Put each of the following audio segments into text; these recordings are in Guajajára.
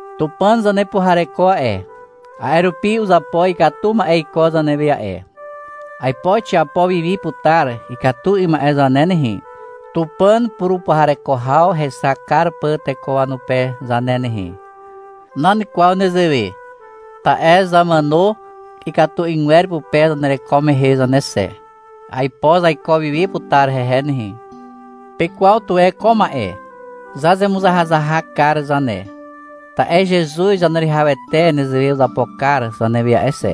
Tupàn zanepuhareko a'e, a'e rupi uzapo ikatu ma'e iko zanewe a'e. Aipo xiapo wi wi putar ikatu 'ym ma'e zane nehe, Tupàn purupuhareko haw hexak kar pà teko wanupe zane nehe. Nan kwaw nezewe. Ta'e zamàno ikatu 'ygwer pupe zanereko mehe zane xe. Aipo zaiko wiwi putar hehe nehe. Pekwaw tuwe ko ma'e. Zazemuzahazahak kar zane, ta'e Zezuz Zaneruwihawete nezewe uzapo kar zanewe a'e xe.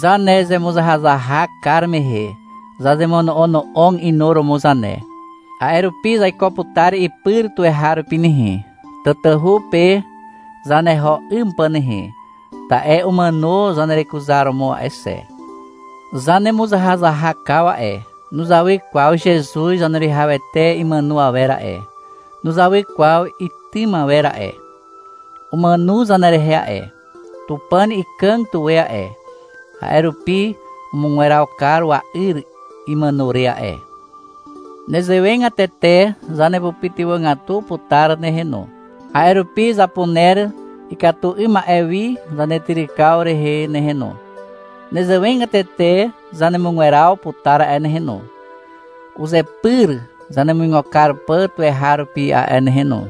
Zanezemuzahazahak kar mehe zazemono'ono'og inuromo zane. A'e rupi zaiko putar ipyr tuweharupi nehe, tatahu pe zaneho 'ym pà nehe, ta'e umàno zanerekuzaromo a'e xe. Zanemuzahazahakaw a'e, nuzawy kwaw Zezuz Zaneruwihawete imàno awer a'e, nuzawy kwaw itym awer a'e. Umàno zanerehe a'e. Tupàn ikàg tuwe a'e, a'e rupi umugweraw kar wa'yr imàno re a'e. Nezewegatete zanepytywàgatu putar nehe no. A'e rupi zapuner ikatu 'ym ma'e wi zanetyrykaw rehe nehe no. Nezewegatete zanemugweraw putar a'e nehe no, uzepyr zanemuigo kar pà tuweharupi a'e nehe no.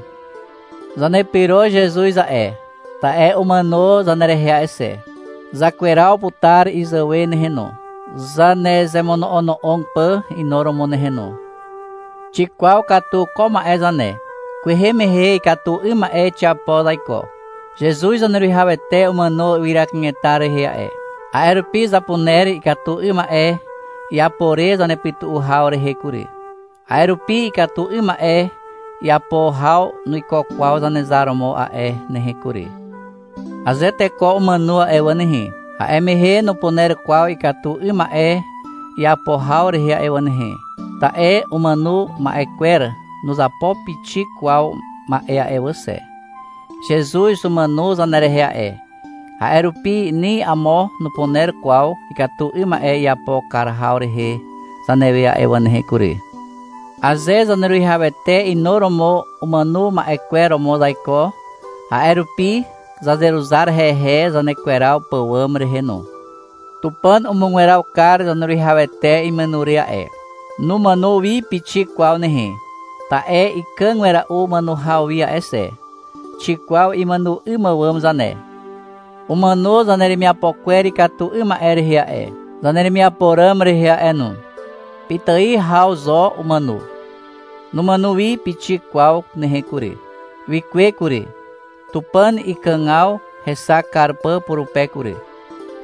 Zanepyro Zezuz a'e, ta'e umàno zanerehe a'e xe. Zakweraw putar izàwe nehe no, zanezemono'ono'og pà inuromo nehe no. Xikwaw katu ko ma'e zane. Kwehe mehe ikatu 'ym ma'e xiapo zaiko. Zezuz Zaneruwihawete umàno ywyra kanetar rehe a'e. A'e rupi zapuner ikatu 'ym ma'e iapo re zanepytu'u haw rehe kury. A'e rupi ikatu 'ym ma'e iapo haw nuiko kwaw Zanezar romo a'e nehe kury. Aze teko umàno a'e wà nehe, a'e mehe nupuner kwaw ikatu 'ym ma'e iapo haw rehe a'e wà nehe. Ta'e umàno ma'e kwer nuzapo pixik kwaw ma'e a'e wà xe. Zezuz umàno zanerehe a'e, a'e rupi ni amo nupuner kwaw ikatu 'ym ma'e iapo kar haw rehe zanewe a'e wà nehe kury. Aze Zaneruwihawete inuromo umàno ma'e kwer romo zaiko, a'e rupi zazeruzar hehe zanekweraw pàwàm rehe no. Tupàn umugweraw kar Zaneruwihawete imàno re a'e. Numàno wi pixik kwaw nehe. Ta'e ikàg wera'u màno haw wi a'e xe. Xikwaw imàno 'ym àwàm zane. Umàno zaneremiapo kwer ikatu 'ym ma'e rehe a'e, zaneremiapo ràm rehe a'e no. Pitài haw zo umàno. Numàno wi pixik kwaw nehe kury. Wikuwe kury, Tupàn ikàgaw hexak kar pà purupe kury,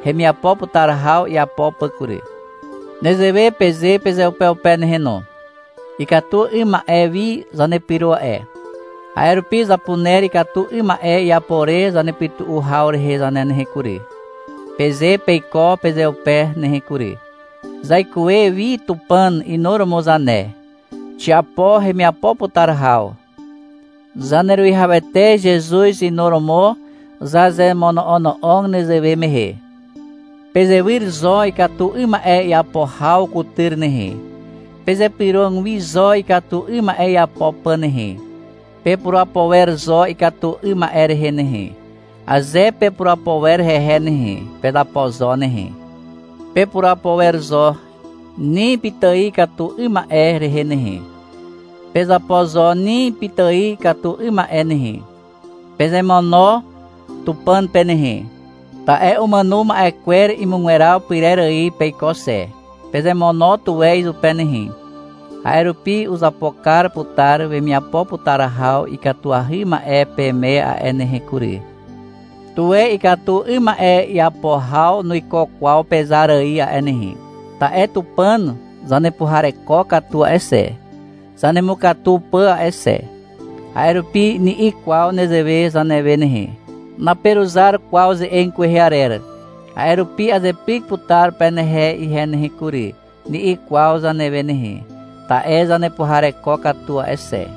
hemiapo putar haw iapo pà kury. Nezewe peze pezeupeupe nehe no. — Ikatu 'ym ma'e wi zanepyro a'e. A'e rupi zapuner ikatu 'ym ma'e iapo re zanepytu'u haw rehe zane nehe kury, peze peiko pezeupe nehe kury. — Zaikuwe wi Tupàn inuromo zane. Xiapo hemiapo putar haw. Zaneruwihawete Zezuz inuromo zazemono'ono'og nezewe mehe. Pezewyr zo ikatu 'ym ma'e iapo haw kutyr nehe. Pezypyrog wi zo ikatu 'ym ma'e iapo pà nehe. Pepurapo wer zo ikatu 'ym ma'e rehe nehe. Aze pepurapo wer hehe nehe, pezapo zo nehe. Pepurapo wer zo ni pitài ikatu 'ym ma'e rehe nehe. Pezapo zo ni pitài ikatu 'ym ma'e nehe. Pezemono Tupàn pe nehe. Ta'e umàno ma'e kwer imugweraw pyrer ài peiko xe. Pezemono tuwe izupe nehe. A'e rupi uzapo kar putar wemiapo putar haw ikatuahy ma'e peme a'e nehe kury. Tuwe ikatu 'ym ma'e iapo haw nuiko kwaw pezar ài a'e nehe. Ta'e Tupàn zanepuhareko katu a'e xe, zanemukatu pà a'e xe. A'e rupi ni'i kwaw nezewe zanewe nehe. — Naperuzar kwaw ze'eg kwehe arer, a'e rupi azepyk putar penehe ihe nehe kury, ni'i kwaw zanewe nehe, ta'e zanepuhareko katu a'e xe.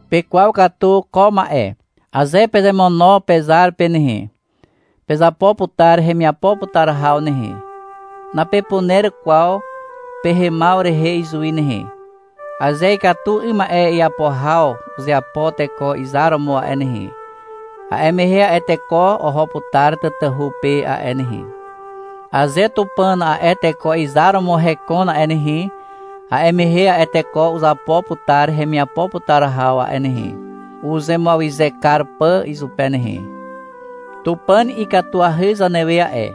Pekwaw katu ko ma'e. Aze pezemono pezar pe nehe, pezapo putar hemiapo putar haw nehe, napepuner kwaw pehemaw rehe izuwi nehe. Aze ikatu 'ym ma'e iapo haw uzeapo teko izar romo a'e nehe, a'e mehe a'e teko oho putar tatahu pe a'e nehe. Aze Tupàn a'e teko izar romo hekon a'e nehe, a'e mehe a'e teko uzapo putar hemiapo putar haw a'e nehe, uzemuawyze kar pà izupe nehe. Tupàn ikatuahy zanewe a'e.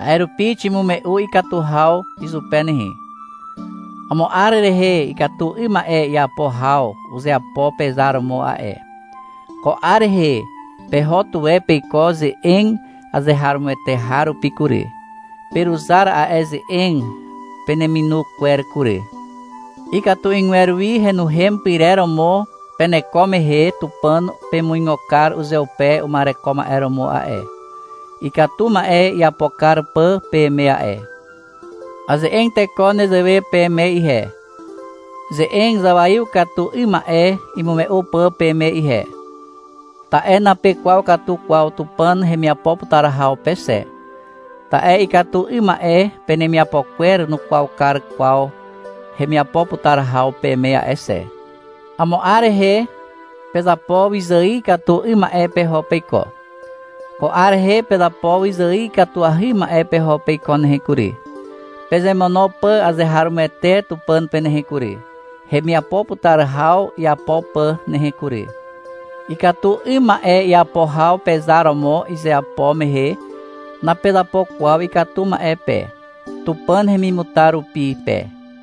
A'e rupi ximume'u ikatu haw izupe nehe. Amo 'ar rehe ikatu 'ym ma'e iapo haw uzeapo pezar romo a'e. Ko 'ar rehe peho tuwe peiko ze'eg azeharomoete har rupi kury. Peruzar a'e ze'eg peneminu kwer kury. Ikatu 'ygwer wi henuhem pyrer romo peneko mehe Tupàn pemuigo kar uzeupe uma'ereko ma'e romo a'e, ikatu ma'e iapo kar pà peme a'e. Aze'eg teko nezewe peme ihe, ze'eg zawaiw katu 'ym ma'e imume'u pà peme ihe, ta'e napekwaw katu kwaw Tupàn hemiapo putar haw pe xe, ta'e ikatu 'ym ma'e penemiapo kwer nukwaw kar kwaw hemiapo putar haw peme a'e xe. Amo 'ar rehe pezapo wyzài ikatu 'ym ma'e peho peiko. Ko 'ar rehe pezapo wyzài ikatuahy ma'e peho peiko nehe kury, pezemono pà azeharomoete Tupàn pe nehe kury, hemiapo putar haw iapo pà nehe kury. Ikatu 'ym ma'e iapo haw pezar romo izeapo mehe, napezapo kwaw ikatu ma'e pe, Tupàn hemimutar rupi pe.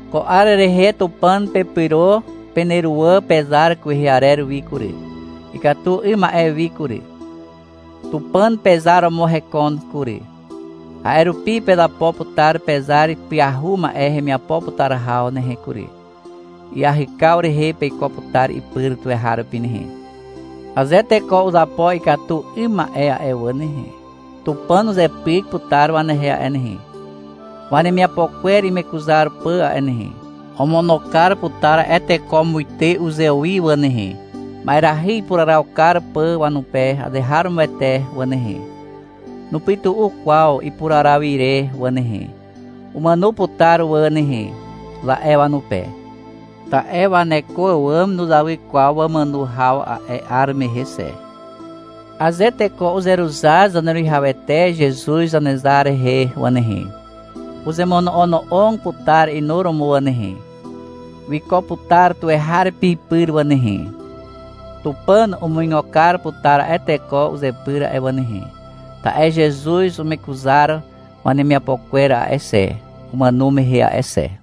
Ko 'ar rehe Tupàn pepyro peneruwà pezar kwehe arer wi kury, ikatu 'ym ma'e wi kury. Tupàn pezar romo hekon kury. A'e rupi pezapo putar pezar pyahu ma'e hemiapo putar haw nehe kury. Iahykaw rehe peiko putar ipyr tuweharupi nehe. Aze teko uzapo ikatu 'ym ma'e a'e wà nehe, Tupàn uzepyk putar wanehe a'e nehe, wanemiapo kwer imekuzar pà a'e nehe. Omono kar putar a'e teko muite uzewi wà nehe, ma'erahy ipuraraw kar pà wanupe azeharomoete wà nehe. Nupytu'u kwaw ipuraraw ire wà nehe. — Umàno putar wà nehe, za'e wanupe. Ta'e waneko àwàm nuzawy kwaw wamàno haw a'e 'ar mehe xe. Aze teko uzeruzar Zaneruwihawete Zezuz Zanezar rehe wà nehe, uzemono'ono'og putar inuromo wà nehe. Wiko putar tuweharupi ipyr wà nehe. Tupàn umuigo kar putar a'e teko uzepyr a'e wà nehe, ta'e Zezuz umekuzar wanemiapo kwer a'e xe, umàno mehe a'e xe.